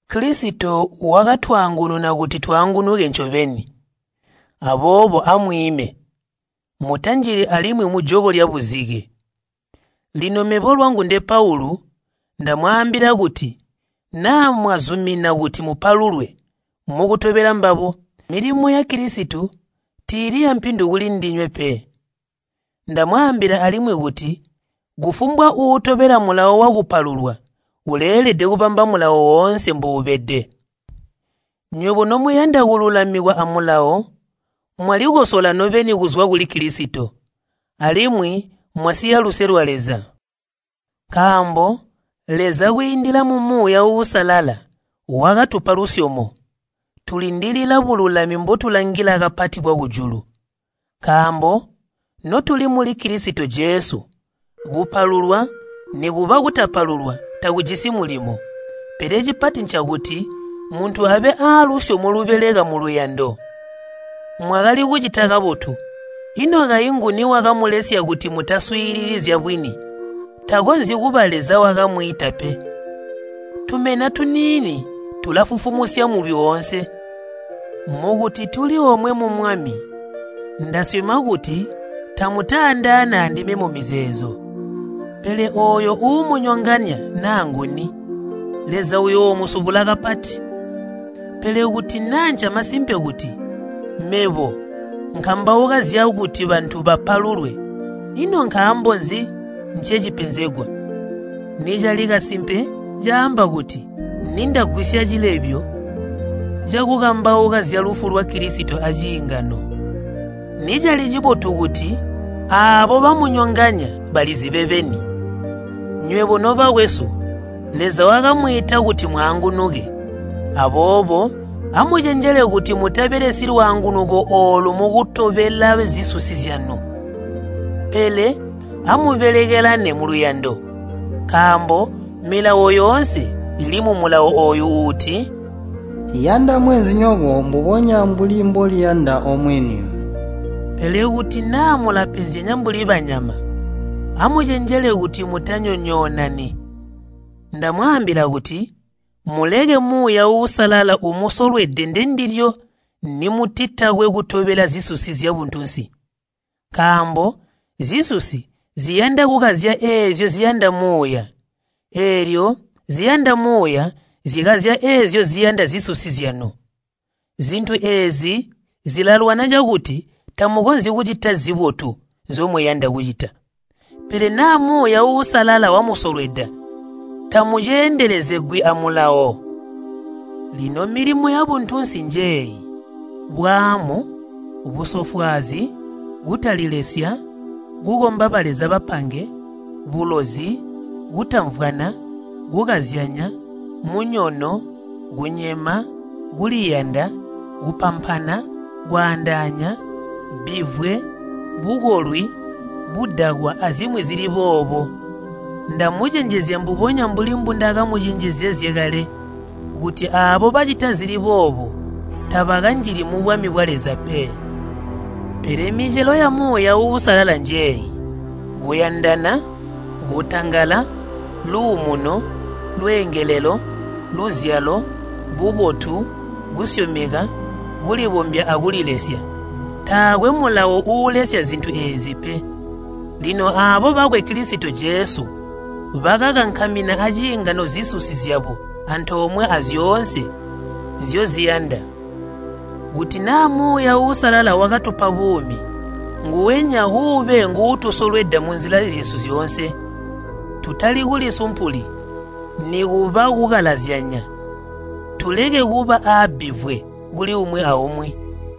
Kilisito wakatwaangununa kuti twaangunuke ncobeni. Aboobo amwiime, mutanjili alimwi mujoko lyabuzike. Lino mebo lwangu nde Paulu, ndamwaambila kuti naa mwazumina kuti mupalulwe mukutobela mbabo, milimo ya Kilisito tiili yampindu kulindinywe pe. Ndamwaambila alimwi kuti kufumbwa uutobela mulawo wakupalulwa uleelede kubamba Mulawo woonse mbuubede. Nywebo nomuyanda kululamikwa amulawo, mwalikosola nobeni kuzwa kuli Kilisito, alimwi mwasiya luse lwa Leza. Nkaambo, Leza kwiindila mu Muuya Uusalala wakatupa lusyomo, tulindilila bululami mbotulangila kapati bwakujulu. Nkaambo notuli muli Kilisito Jesu, kupalulwa nikuba kutapalulwa takujisi mulimo, pele cipati ncakuti muntu abe aalusyomo lubeleka muluyando. Mwakali kucita kabotu, ino kayi nguni wakamulesya kuti mutaswiilili zyabwini? Takonzyi kuba Leza wakamwiita pe. Tumena tuniini tulafufumusya mulwi oonse. Mukuti tuli omwe mu Mwami, ndasyoma kuti tamutaandaane andime mumizeezo. Pele ooyo uumunyonganya naa nguni, Leza uyoomusubula kapati. Pele kuti naa ncamasimpe kuti mebo nkambauka zyakuti bantu bapalulwe, ino nkaambo nzi ncecipenzegwa? Nicali cakasimpe, caamba kuti nindagwisya cilebyo cakukambauka zyalufu lwa Kilisito aciingano. Nicali cibotu kuti aabo bamunyonganya balizibe beni. Nywebo nobakwesu, Leza wakamwiita kuti mwaangunuke. Aboobo amucenjele kuti mutabelesyi lwaangunuko oolu mukutobela zisusi zyanu. Pele amubelekelane muluyando. Nkaambo Milawo yoonse ili mumulawo ooyu uuti, “Yanda mweenzinyoko mbubonya mbuli mboliyanda omwini.” Pele kuti naa mulapenzyanya mbuli banyama, amucenjele kuti mutanyonyoonani. Ndamwaambila kuti muleke Muuya Uusalala umusolwede ndendilyo nimutakwe kutobela zisusi zyabuntunsi. Nkaambo zisusi ziyanda kukazya eezyo ziyanda Muuya, eelyo ziyanda Muuya zikazya eezyo ziyanda zisusi zyanu. Zintu eezi zilalwana cakuti tamukonzyi kucita zibotu nzyomuyanda kucita. Pele naa Muuya Uusalala wamusolweda, tamuceendelezegwi a Mulawo. Lino milimo yabuntunsi njeeyi, bwaamu, busofwaazi, kutalilesya, kukomba baleza bapange, bulozi, kutamvwana, kukazyanya, munyono, kunyema, kuliyanda, kupampana, kwaandaanya, bbivwe, bukolwi, budakwa azimwi zili boobo. Ndamucenjezya mbubonya mbuli mbundakamucenjezezye kale, kuti aabo bacita zili boobo tabakanjili mubwami bwa Leza pe. Pele micelo ya Muuya Uusalala njeeyi, kuyandana, kutangala, luumuno, busicamba, luzyalo, bubotu, kusyomeka, kulibombya akulilesya. Taakwe mulawo uulesya zintu eezi pe. Lino aabo bakwe Kilisito Jesu, bakakankamina aciingano zisusi zyabo antoomwe azyoonse nzyoziyanda. Kuti naa Muuya Uusalala wakatupa buumi, nguwenya uube nguutusolweda munzila zyesu zyoonse. Tutali kulisumpuli, nikuba kukalazyanya, tuleke kuba aabbivwe kuli umwi aumwi.